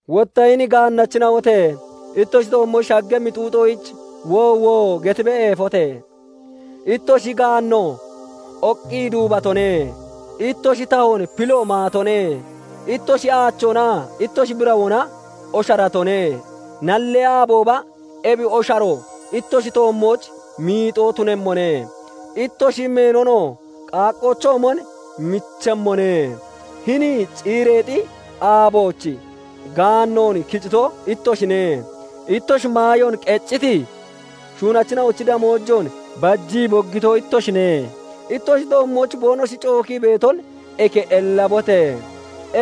Wotta hini gaannachina'ote! Ittoshi toommooch shaggemmi xuuxoyich "Woowo!" getibee eefote! Ittoshi gaanno oqqii duubatone; ittoshi tahoon pillo maatone; ittoshi aachoonaa ittoshi birawoona osharatone; nallee aabooba ebi osharo ittoshi toommooch miixoo tunemmone; ittoshi meenonoo qaaqqoochoomon michemmone. Hini ciireexi aabooch gaannoon kicito ittoshine. Ittoshi maayoon qecciti shuunachina'ochi damoojoon bajii boggito ittoshine. Ittoshi toommooch boonoshi cookii beeton eke ellabote!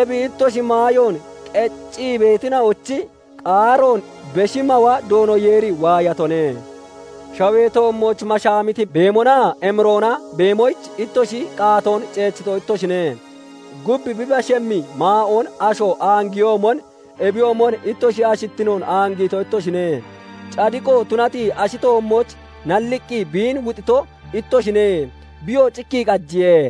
Ebi ittoshi maayoon qeccii beetina'ochi qaaroon Beshi Mawa Doono Yeeri waayatone. Shawee toommooch mashaamiti beemonaa emiroona beemoyich ittoshi qaatoon ceechito ittoshine. Gub bi bashemmi maa'oon asho aangiyoomon, ebiyoomon ittoshi ashittinoon aangiito ittoshine. Cadiqo tunati ashi toommooch nalliqqi biin wuxito ittoshine; biyoo cikkii qajiye.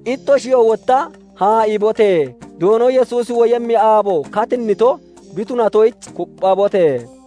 Ittoshiyoo wotta haa'iibote! Doono Yesuusi woyemmi aabo katinnito bi tunatoyich kupphabote!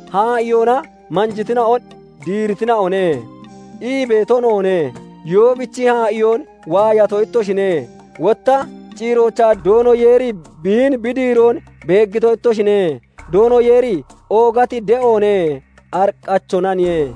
Haa'iyoona manjitina'on "Diireetina'one" ii beeto noone. Yoobichi haa'iyoon waayato ittoshine; wotta ciiroochaa Doono Yeeri biin bi diiroon beeggito ittoshine; Doono Yeeri oogati de'oone; ariqqachoonaniye.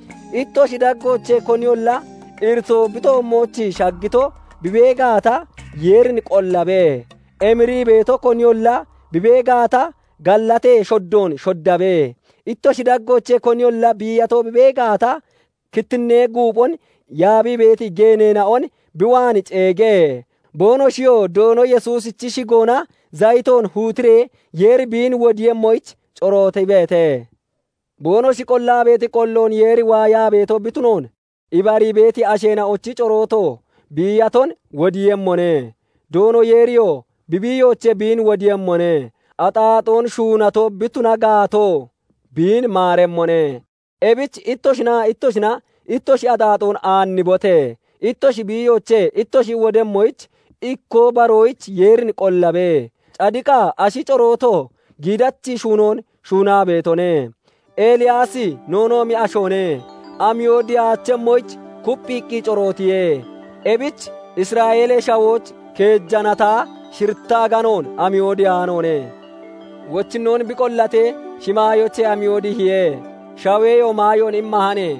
Ittoshi daggoochee koniyolla iritoo bi toommooch shaggito bi bee gaata, Yeerin qollabe. Emirii beeto koniyolla bi bee gaata, gallatee shoddoon shoddabe. Ittoshi daggoochee koniyolla biiyato bi bee gaata, kittinnee guuphon yaabii beeti geeneena'on bi waan ceege; boonoshiyoo Doono Yesuusichi shigoona zayitoon huutiree Yeeri biin wodiiyemmoyich corootibeete. Boonoshi qollaa beeti qolloon Yeeri waayaa beeto bi tunoon ibarii beeti asheena'ochi corooto biiyaton wodiiyemmone; Doono Yeeriyoo bi biiyoochee biin wodiiyemmone; axaaxoon shuunato bi tuna gaatoo, biin maaremmone. Ebich ittoshinaa ittoshina ittoshi axaaxoon aannibote! Ittoshi biiyoochee ittoshi wodemmoyich ikkoo baroyich Yeerin qollabe; cadiqa ashi corooto giidachi shuunoon shuunaa beetone. Eliyaasi noonoomi ashoone; amiyo dihaachemmoyich kupphiiqqi corootiye; ebich Isra'eelee Shawooch keeja nattaa shiritta aganoon amiyo dihaanoone. Wochinnoon bi qollatee, shimaayoochee amiyo dihiye; shaweyoo maayoon immahane.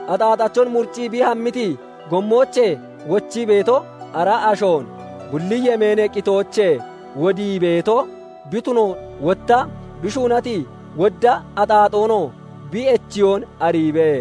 axaaxachon muriccii bi hammiti gommoochee wochii beeto, ara ashoon bulli yemeenee qitoochee wodii beeto bi tunoon, wotta bi shuunati wodda axaaxoonoo bi echiyoon ariibe.